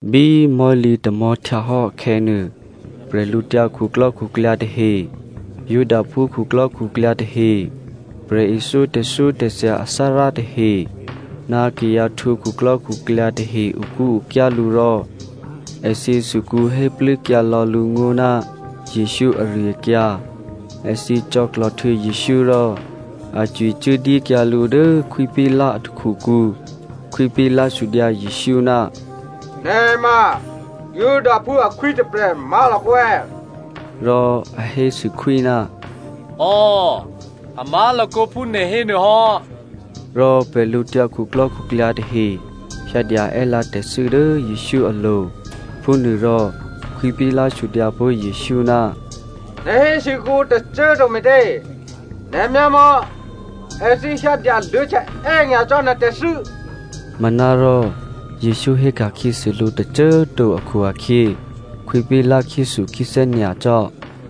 Bí mò̤́lǐ tamò̤́htyahò́ akhè̌nuô, bwídukhu tahe, Judaphú khuklò́khuklyǎ tahe, prè̤ithyó tè̤thyótè̤thya athárá tahe, ná kayǎ htwǒ khuklò́khuklyǎ tahe okúokyá lǔ rò èthǐ sukǔ héplû́kyǎ lò̌ lǔ ngó̤ ná Jesǔ ari-akyǎ. Èthǐ cò̌klòhtuô̌ Jesǔ rò a cwicuốdyékyǎ lǔ dố Khwí Pilato a takhukǔ. Khwí Pilato sudyǎ Jesǔ, “Nè̤ ma Judaphú akhwí tôprè̤ má̤lakǒ è̌?” Rò a hésû khwí, “Ò, a má̤lakǒ phú nè̤ hénuô hò́.” Rò bwídukhu tahe hyǎdya è́lǎ tè̤thû́ dố Jesǔ alo̤. Phúnuôrò Khwí Pilato sudyǎ pó̤ Jesǔ, “Nè̤ hésû kuô̌ǔ tôcô꤮ to me̤tě? Nè̤ myámò̌, èthǐ hyǎ dyaluô̌htya è́nyacò́ nè̤ tè̤thû́.” Manárò Jesǔ héka̤khyěsû lǔ tôcô꤮ to akhu-akhyě Khwí Pilato khyéthukhyéthè́ nyacò́.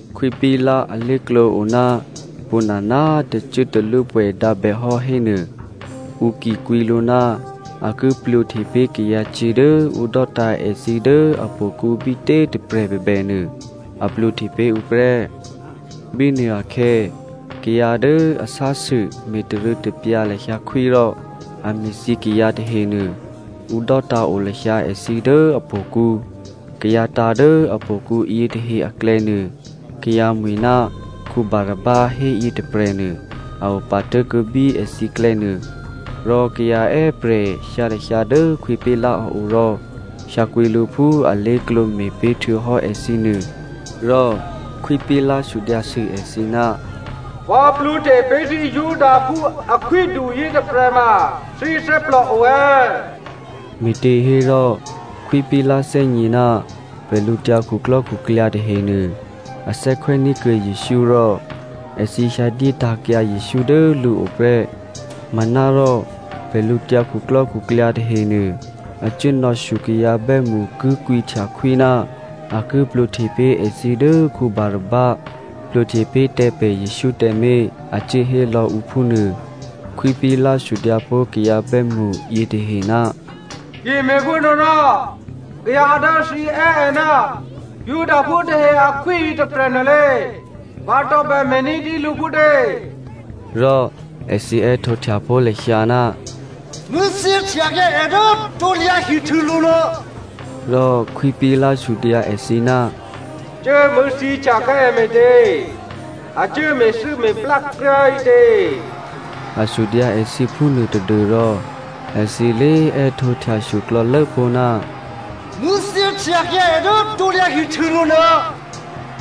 Khwí Pilato alé̤klǒ o ná pwǒ̤nana꤮ tè̤cuốtalwópwè̌ dǎ bè hò́hénuô, ǔ ki kwǐ lǔ ná a ki plwǒhte pé̤ kayǎcyě̤ dố ǔ dò́tǎ̤ èthǐ dố htò̌kǔ bítě꤮ tôprè̤ bèbènuô, a plwǒhte pé̤ ǔ prè́. Bínuôakhè̌ kayǎ dố a sásû me̤tarû̌tapyǎ lahyǎ khwí rò a me̤thyě kayǎ tahenuô, ǔ dò́tǎ̤o lahyǎ èthǐ dố htò̌kǔ. Kayǎ tǎ̤ dố htò̌kǔ yětahe aklè̌nuô kayǎ mwi̤ ná Barabba héyětôprè̤nuô a opatố̤kuô̌ bí èthǐklè̌ nuô. Rò kayǎ è́prè̤ hyǎ lahyǎ dố Khwí Pilato a o rò hyǎkwǐ lǔ phú alé̤klǒ me̤pé̤ htuô̌hò́ èthǐ nuô. Rò Khwí Pilato sudyǎsû èthǐ, “Vǎ plwǒhte pé̤ thǐ Judaphú akhwídu yětôprè̤ ma thǐ thè́plò o è̌?” Me̤těhérò Khwí Pilato thè́gně ná bwídukhu tahenuô, a thè́khwè́ní̤kuô̌ Jesǔ rò èthǐ hyǎdyétǎ̤kyǎ Jesǔ dố lǔo prè́. Manárò bwídukhu tahenuô a cuốnò̌shyo kayǎ bè́mṳ ki kwǐhtya khwí ná a ki plwǒhte pé̤ èthǐ dố Barabba, plwǒhte pé̤ tǎ pè̤ Jesǔ tǎmé̤, a cuốhé lò̌ǔ phúnuô. Khwí Pilato sudyǎpó̤ kayǎ bè́mṳ yětahe, “Ki me̤phúnuôrò kayǎ dố thǐ è́ è ná Judaphú tahe akhwí yětôprè̤ nuôlě vǎ tǒbè me̤ ní̤dyé lǔ phútě?” Rò èthǐ è́htǒhtya pó̤ lahyǎ, “Mṳ̂̌thyěhtyakyǎ è dố krusulo̤ nuô!” Rò Khwí Pilato sudyǎ èthǐ, “Cuố mṳ̂̌thyěhtyakyǎ è me̤tě? A cuố me̤thû́me̤plá kryá꤮ ǐtě?” A sudyǎ èthǐ phúnuô tadû́rò èthǐ lé꤮ è́htǒhtyashyo klò̌lố pó̤, “Mṳ̂̌thyěhtyakyǎ è dố krusulo̤ nuô!”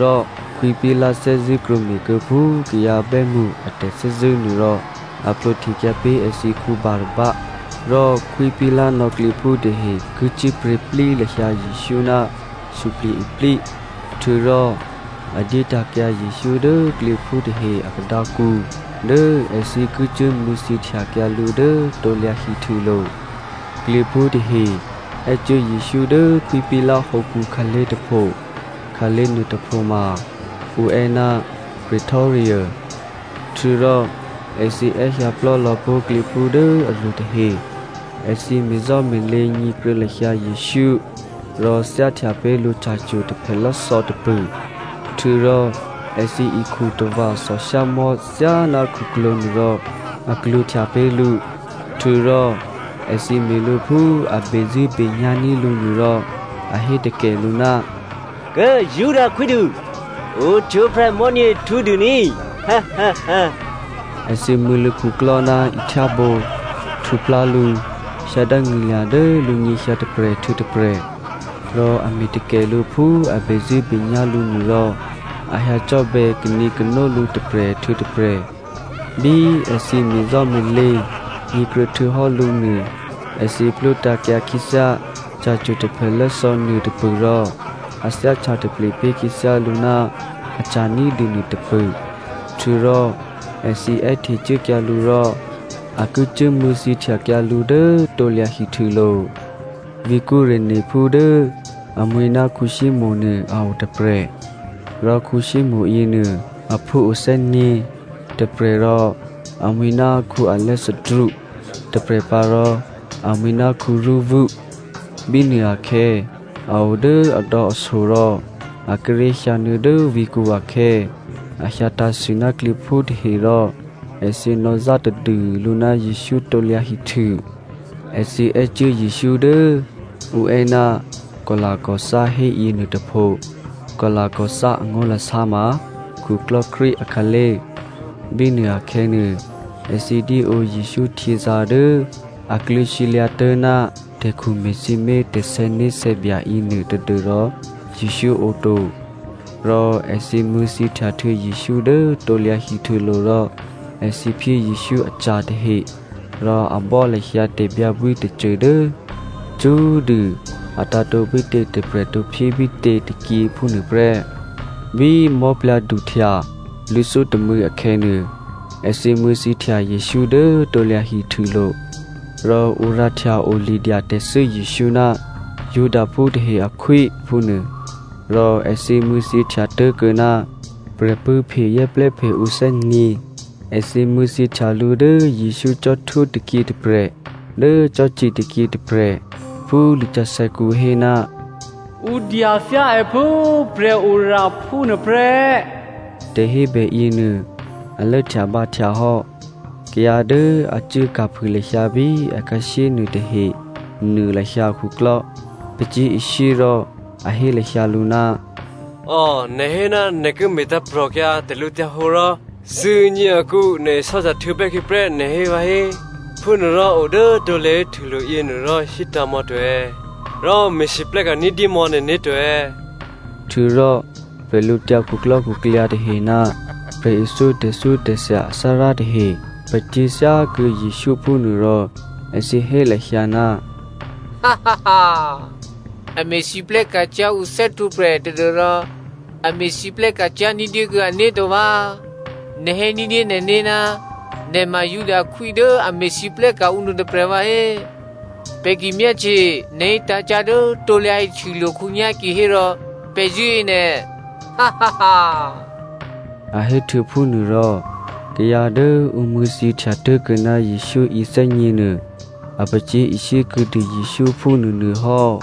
Rò Khwí Pilato thè́zṳ̂́ krwǒme̤kuô̌ phú kayǎ bè́mṳ a tè̤thè́zṳ̂́ nuô rò a plwǒhtekyǎ pé̤ èthǐ Barabba, rò Khwí Pilato nò̌ klyěphú tahe ki cyé̤pryě̤plí lahyǎ Jesǔ ná suplye̤-iplí, htuô̌rò a dyétǎ̤kyǎ Jesǔ dố klyěphú tahe a khadǎkǔ dố èthǐ ki cuố mṳ̂̌thyěhtyakyǎ lǔ dố krusulo̤. Klyěphú tahe è́cuố Jesǔ dố Khwí Pilato hǒkǔ khǎlé̤ tôpho. (Khǎlé̤ nuôtôpho ma ǔ è́ ná Pretorium) htuô̌rò èthǐ è́hyǎplò́ lò̌ pó̤ klyěphú dố aruô tahe. Èthǐ me̤zò́me̤lě nyě̤kruô̌ lahyǎ Jesǔ rò thyáhtya pé̤ lǔ ca̤cwo̤ taphèlò́thò̌ tôpṳ̂. Htuô̌rò èthǐ ikhu tava̤ thòshyámò̤́ thyáná khuklwǒ̤ nuôrò a klwǒ̤htya pé̤ lǔ. Htuô̌rò èthǐ me̤ lǔ phú a bezṳ̂́benyá̤ní̤ lǔ nuô rò a hétakè lǔ, “Kố꤮ Juda akhwídu, ohtwǒprè̤ mò̤́nyě htǔdû ní꤮!” Èthǐ mṳ̂̌ lǔkhuklò́ ná ihtyábǒ, htuplá lǔ, hyǎ dángṳ̂lya̤ dố lǔnyěhyǎ tôprè̤ htuô̌ tôprè̤, rò a me̤takè lǔ phú a bezṳ̂́benyá̤ lǔ nuô rò a hyǎcò́bè̌ kanǐkano lǔ tôprè̤ htuô̌ tôprè̤. Bí èthǐ me̤zò́me̤lě nyě̤kruô̌htuô̌hò́ lǔ nuô èthǐ plwótǎ̤kyǎ khyěthyá ca̤cwo̤ taphèlò́thò̌ nuôtôpṳ̂ rò a thyáhtya taple pé̤ khyěthyá lǔ ná aca̤ ní̤dû nuôtôpṳ̂. Htuô̌rò èthǐ è́htecuốkyǎ lǔ rò a ki cuố mṳ̂̌thyěhtyakyǎ lǔ dố krusulo̤. Vǐ̤ Cyreneophú dố amwi̤ ná Simonè nuô a o tôprè̤, rò Simonè yěnuô, a phúo thè́nyě̤, tôprè̤ rò amwi̤ ná Alexandro, tôprè̤pǎ rò amwi̤ ná Rufo. Bínuôakhè̌ a o dố adò̌aso rò a kíré̤ hyǎnuô̌ dố vǐ̤kǔ akhè̌, a hyǎ tǎ̤sû ná klyěphú tahe rò èthǐ nò̌zá tadû lǔ ná Jesǔ krusu. Èthǐ è́cuố Jesǔ dố ǔ è́ ná Golgotha hé yěnuôtôpho. (Golgotha angó̤lasá ma khuklò́krwí akhǎlé̤). Bínuô akhè̌nuô, èthǐ dyéǒ Jesǔ htyězǎ̤ dố a kluô̌sǐlyǎ̤ tố̤ná tè̤khu me̤sǐmé̤ tè̤sè̌né̤sè̌bya yěnuô tadû́rò Jesǔ ǒ to. Rò èthǐ mṳ̂̌thyěhtyahtuô̌ Jesǔ dố krusulo̤ rò èthǐ phyé Jesǔ aca̤ tahe rò a bò́ lahyǎ tè̤byǎbwí tôcô dố cṳ́꤮ dû a tǎ̤tǒ bítě tôprè̤ tǒphyé bítě tôkyě phúnuôprè́. Bí mò̤́plyǎ̤sè̌htya lwǐ̤thyótômû̌ akhè̌nuô, èthǐ mṳ̂̌thyěhtya Jesǔ dố krusulo̤. Rò ǔ rǎhtya o lidyatè̤thû́ Jesǔ, “Judaphú tahe akhwí” phúnuô, rò èthǐ mṳ̂̌thyěhtya tố̤kuô̌ ná prè̤pṳ̂́phe zè́plè́phe ǔ thè́nyě̤. Èthǐ mṳ̂̌thyěhtya lǔ dố Jesǔ cò́htwó tôkyě tôprè̤ dố cò́ci tôkyě tôprè̤. (Phú lisǎsè̌kǔ hé, “Ǔ dyathyá è phú prè̤oraphú nuôprè́,” tè̤hébè yěnuô a lốhtyabǎhtya hò́.) Kayǎ dố a cuốka̤phû lahyǎ bí akhǎshyé nuôtahe nuô lahyǎ akhuklò́, pacyé̤ishyé rò a hé lahyǎ lǔ, “Ò꤮ nè̤ hé ná nè̤ ki me̤tǎ̤prò̤kyǎ tè̤lǔhǒdu rò thuô̌nyě akǔ nè̤ isò́htya htuô̌bè́ khyěprè́ nè̤ hé vǎhé. Phúnuôrò o dố krusulo̤ yěnuôrò hítǎ̤ mò̌ to rò me̤lwóhteka̤ ní̤dyémò̌ nè̤né̤ to.” Htuô̌rò, bwídukhu tahe ná prè̤ithyó tè̤thyótè̤thya athárá tahe pacyé̤ thyákuô̌ Jesǔ phúnuô rò èthǐ hé lahyǎ, “A me̤lwóhteka̤ cyá̤ ǔ thè́htwǒprè̤ tadû́rò a me̤lwóhteka̤ cyá̤ ní̤dyékuô̌ ané̤to vǎ꤮. Nè̤ hé ní̤dyé nè̤né̤ ná nè̤ ma Juda akhwí dố a me̤lwóhteka̤ ǔ nuôtôprè̤ vǎhé. Pè̤ ki myáhtye nè̤ hítǎ̤ cyá̤ dố krusulo̤ khǒnyá̤ kihérò pè̤ zṳ̂́e nè̤,” a héhtuô̌ phúnuôrò, kayǎ dố ǔ mṳ̂̌thyěhtya tố̤kuô̌ ná Jesǔ yěthè́nyě̤nuô a pacyé̤ishyé kuô̌dû Jesǔ phúnuônuôhò́.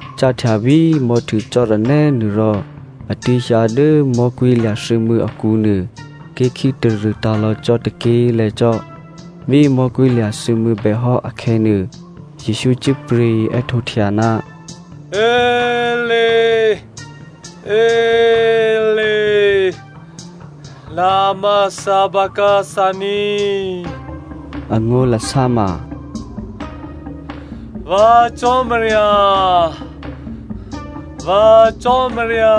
Cáhtya bí mò̤́htuô cò́ranè́ nuô rò a tuố̤hyǎ dố mò̤́kwí̤lya̤ thuô̌mû̌ akǔnuô ké̤ khítarṳ̂ tǎ̤lò̌ cò́ tôké̤lè̤̌ cò́. Bí mò̤́kwí̤lya̤ thuô̌mû̌ bèhò́ akhè̌nuô, Jesǔ cyé̤pryě̤ è́htǒhtya, “Éli, Éli, lema sabathani,” angó̤lasá ma “Vǎ Cò́marya, vǎ Cò́marya,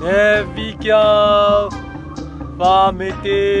nè̤ vǐkyǎ vǎ me̤tě?”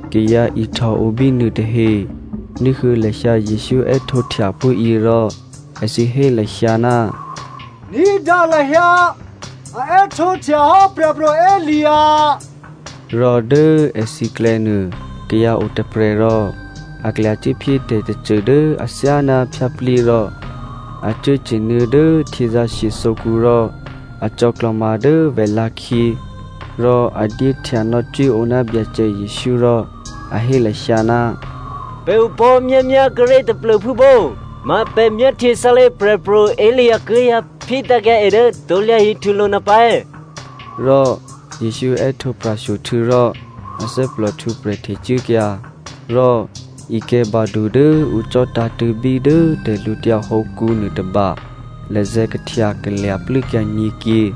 Kayǎ ihtòo bínuô tahe ní̤huô̌ lahyǎ Jesǔ è́htǒhtya phúyě rò èthǐ hé lahyǎ, “Ní̤dǎ lahyǎ, a è́htǒhtyahò́ Prè̤pro̤ Elia.” Rò dố èthǐklè̌nuô kayǎ o tôprè̤ rò a klyacuốphyé tè̤tôcô dố athyáná phyáplyé rò a cuốcye̤nuô̌ dố htyězǎ̤shye thǒkǔ rò a cò̌klò̤ma dố vèlǎ̤khyě rò a dyéhtya nò̌cwíǒ ná Byacè Jesǔ rò a hé lahyǎ, “Pè̤ opò̤́myámyá kuốré̤ taplô̤phú pó̤, ma pè̤ myáhtye sálé̤ Prè̤pro̤ Elia ki hyǎphyétǎ̤kyǎ è dố krusulo̤ nuôpǎ è̌.” Rò Jesǔ è́htǒ pra̤shyo htuô̌rò athè́plò htwǒprè̤ htecuốkyǎ. Rò ikè̤̌badu dố ǔ cò̤́tǎ̤tṳ̂̌bí dố tè̤lǔtyǎ hǒkǔ nuôtôba lazè̤̌ kahtyakalya̤ plû́kyǎ nyě̤kyě.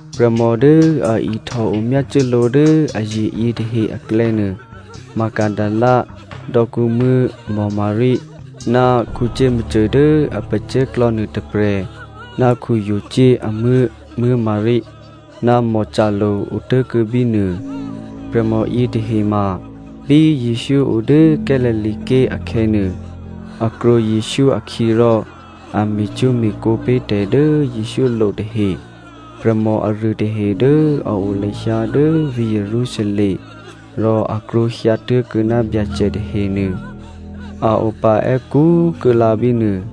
Prè̤mò dố a ihtòo myácuốlǒ dố aye̤ yětahe aklè̌nuô Magdalena dò̌kǔmuố̤ Maria, ná Jakomo dố a pacè̤̌klò̌ nuôtôprè̤ ná Jose amuố̤ Maria, ná Salome otố̤kuô̌ bínuô. Prè̤mò yětahe ma bí Jesǔ o dố Galilea ké̤ akhè̌nuô, a krwǒ Jesǔ akhyě rò a me̤cwó̤me̤kǒ pé̤ tè̤ dố Jesǔ lo tahe. Prè̤mò aruô tahe dố a o lahyǎ dố vǐ̤ Jerusalem rò a krwǒhyǎ tố̤kuô̌ ná Byacè tahenuô a opa è́kú kuô̌lǎ bínuô.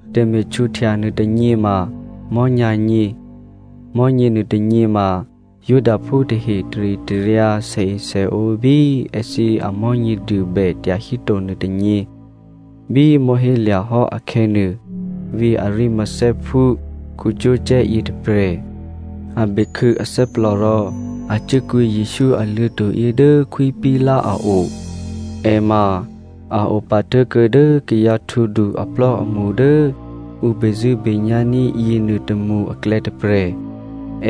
Tè̤me̤htwǒhtya nuôtônyě ma mò̤́nyǎ̤nyě. Mò̤́nyě nuôtônyě ma Judaphú tahe taritaryǎ sèesèǒ bí èthǐ amò̤́nyěduô bè tyahíto nuôtônyě. Bí mò̤́hélya̤hò́ akhè̌nuô, vǐ̤ Arimatheaphú Joseph yětôprè̤ a bekhû̌ athè́plò rò a cuốkwǐ Jesǔ aluô̤̌to̤ yě dố Khwí Pilato a o. È ma a opatố̤kuô̌ dố kayǎ htwǒdu aplò́amṳ dố ǔ bezṳ̂́benyá̤ ní̤ yěnuôtômṳ aklè̌ tôprè̤.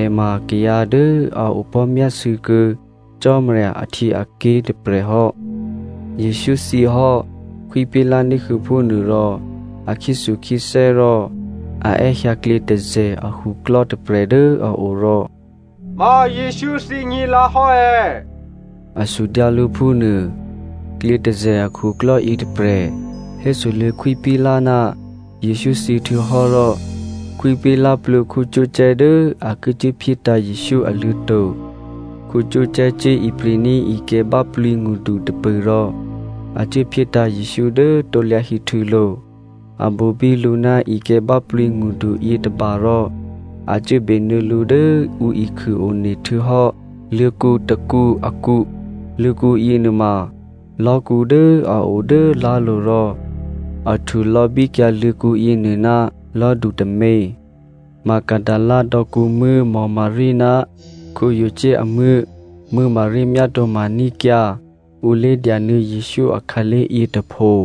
È ma kayǎ dố a opò̤́myásû̌ kuô̌ Cò́marya ahtyěaké̤ tôprè̤ hò́. Jesǔ thyěhò́, Khwí Pilato ní̤huô̌ phúnuô rò a khyéthukhyéthè́ rò a è́hyǎ klyětôzè̤ akhuklò́ tôprè̤ dố a o rò “Ma Jesǔ thyě nyě̤lǎhò́ è̌?” A sudyǎ lǔ phúnuô. Klyětôzè̤ akhuklò́ yětôprè̤ hésoluô̌ Khwí Pilato ná Jesǔ thyěhtuô̌hò́ rò Khwí Pilato plwǒ Joseph dố a ki cuốphyétǎ̤ Jesǔ aluô̤̌to̤. Joseph cuố ipri̤ní̤ ikè̤̌ báplǐngṳdu tôpṳ̂ rò a cuốphyétǎ̤ Jesǔ dố krusulo̤. A bobí lǔ ná ikè̤̌báplǐ ngṳdu yětôba rò a cuố benuô̌ lǔ dố ǔ ikhû one htuô̌hò́ luô̤̌kǔ tôkǔ akǔ. Luô̤̌kǔ yěnuôma lò̤́kǔ dố a o dố lá̤lo̤ rò a htulò̌ bíkyǎ luô̤̌kǔ yěnuô ná lò̤́du tômě. Magdalena dò̌kǔmuố̤ Maria ná Jose amuố̤ Maria myátǒ̤ma ní̤kyǎ ǔ lé̤dyanuô̌ Jesǔ akhǎlé̤ yětôpho.